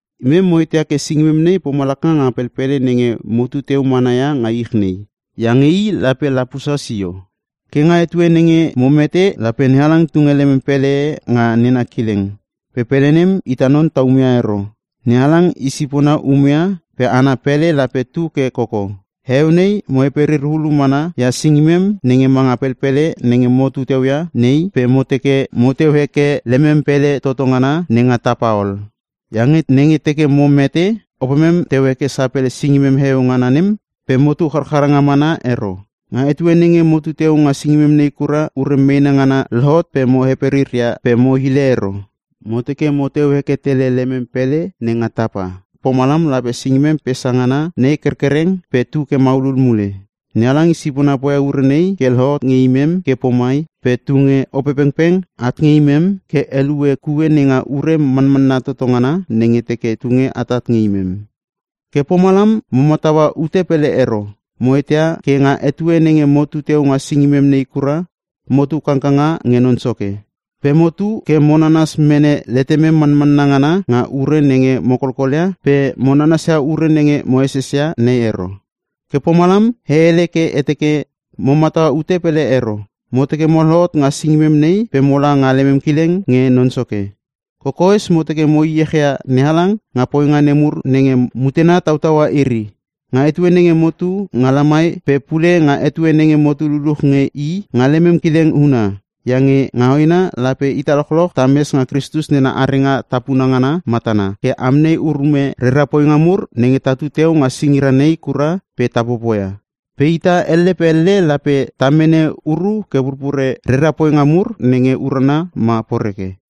Imem mo eteia ke singimem nei pomalaka nga pelpele nenge mo tuteu mana ia nga ich nei, iange i lape lapusa sio. Ke nga etue nenge mo mete lape NeHalang tunge lemem pele e nga nena kileng. Pele nem, ita non ta umeia ero. NeHalang i sipona umeia pe ana pele lape tu ke koko. Heueu nei mo heperir hulu mana ia singimem nenge manga pelpele nenge motu teu ia nei, pe mo teke moteu heke lemem pele toto ngana nenga tapa ol. Iange nenge teke mo mete, opemem teu heke sapele singimem heueu ngana nem pe motu charchara nga mana ero. Nga etue nenge motu teu nga singimem nei kura, ure meena ngana lohot pe mo heperirir ia pe mo hile ero. Mo teke moteu heke tele lemem pele nenga tapa, pomalam lape singimem pesa ngana nei kerkereng pe tu ke maulul mule. NeHalang i sipona poia ure nei ke lohot nge imem ke pomai pe tunge Opepengpeng at nge imem ke helue kue nenga ure manmanna toto ngana nenge teke tunge atat nge imem. Ke pomalam mo mataua ute pele ero. Mo eteia ke nga etue nenge motu teu nga singimem nei kura, motu kangkanga nge Non Soke. Pe motu ke mo nanas mene letemem manmanna ngana nga ure nenge mo kolkolia pe mo nanasia ure nenge mo esesia nei ero. Ke pomalam e hele ke e teke mo mataua ute pele ero. Mo teke mo lohot nga singimem nei pe mola nga lemem kileng nge Non Soke. Kokoes mo teke mo heiech ia NeHalang nga poinga nemur nenge mutena tautaua iri. Nga etue nenge motu nga lamai pe pule nga etue nenge motu luluch nge I nga lemem kileng huna. Iange nga hoena lape ita lochloch tames nga Kristus nena arenga tapuna ngana matana, ke amnei urume rera poinga mur nenge tatu teu nga singira nei kura pe ta popoia. Pe ita elle pe elle lape ta mene uru ke pupure rera poinga mur, rera poinga mur nenge urana ma poreke.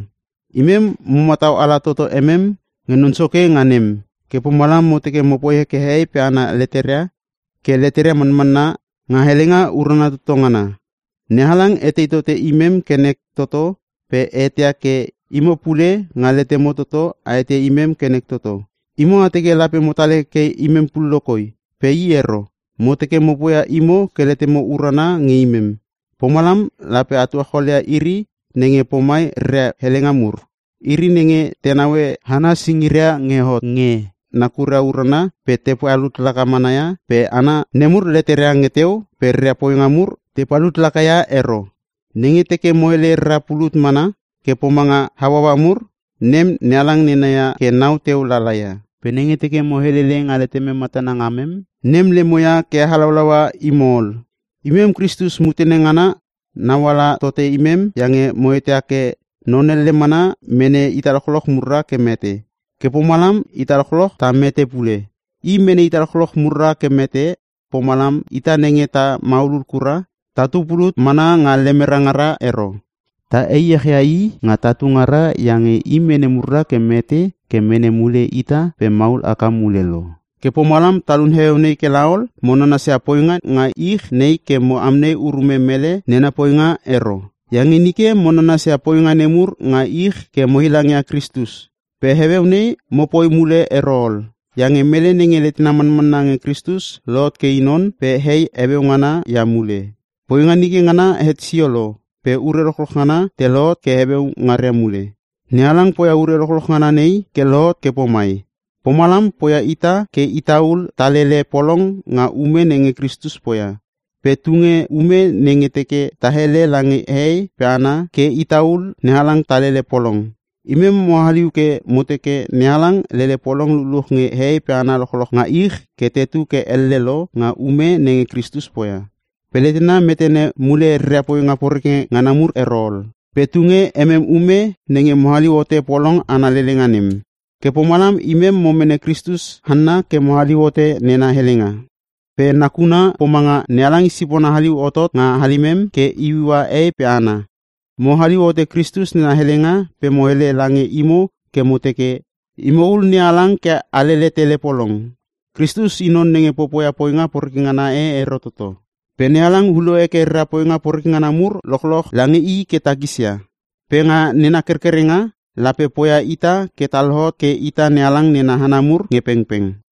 Imem mo matau ala toto emem nge Non Soke nga nem, ke pomalam mo teke mopoi heke hehei pe hana leteria ke leteria manmanna nga helenga urana toto ngana. NeHalang etei tote imem ke nek toto pe e eteia ke imo pule nga letemo toto a eteia imem ke nek toto. Imo a teke lape motal hekeke imem pullo koi, pe i ero. Mo teke mo poia imo ke letemo urana nge imem. Pomalam lape a tuacholia iri nenge pomai reria helenga mur: Iri nenge te naue hana singiria nge hot nge nakuria urana pe te palut laka mana ia, pe hana nemur leteria nge teu pe reria poinga mur te palut laka ia ero. Nenge teke mo hele rara pulut mana ke pomanga hauaua mur, nem NeHalang nena ia ke nau teu lala ia. Pe nenge teke mo helele nga letemem matana ngamem, nem lemo ia ke halaulaua imo ol. Imem Kristus mutena ngana nauala tote imem iange mo eteia ke non elle mana mene ita lochloch murra ke mete. Ke pomalam ita lochloch ta mete pule. I mene ita lochloch murra ke mete, pomalam ita nenge ta maulul kura tatu pulut mana nga lemera ngara ero. Ta heiech ia I nga tatu ngara iange I mene murra ke mete ke mene mule ita pe maul haka mule lo. Ke pomalam talun heueu nei ke la ol, mo nanasia poinga nenga ich nei ke mo amnei urume mele nena poinga ero. Iange nge nike mo nanasia poinga nemur nga ich ke mo heilang ia Kristus, pe heueu nei mopoi mule ero ol. Iange mele nenge letena manmanna nge Kristus lohot ke i non pe hei heueu ngana ia mule. Poinga nike ngana het sio lo pe ure lochloch ngana te lohot ke heueu ngaria mule! NeHalang poia ure lochloch ngana nei ke lohot ke pomai. Pomalam poia ita ke itaul talele polong nga ume nenge Kristus poia. Pe tunge ume nenge teke ta hele lange hehei pe hana ke itaul NeHalang talele polong. Imem mo haliu ke mo teke, NeHalang lele polong luluch nge hehei pe hana lochloch nga ich ke tetu ke elle lo nga ume nenge Kristus poia. Pe letena metene mule reria poinga poreke ngana mur ero ol, pe tunge emem ume nenge mo haliu hote polong ana lelenga nem. Ke pomalam imem mo mene Kristus hanna ke mo haliu hote nena helenga. Pe i nakuna pomanga NeHalang i sipona haliu hotot nga halimem ke iuiua hehei pe hana. Mo haliu hote Kristus nena helenga pe mo hele lange imo ke mo teke, “Imo ul NeHalang ke a lele tele polong.” Kristus i non nenge poia poinga poreke ngana e ero toto. Pe NeHalang ulo heke rera poinga poreke ngana mur lochloch lange i ke takisia. Pe nga nena kerkerenga lape poia ita ke ta lohot ke ita NeHalang nena hana mur nge pengpeng.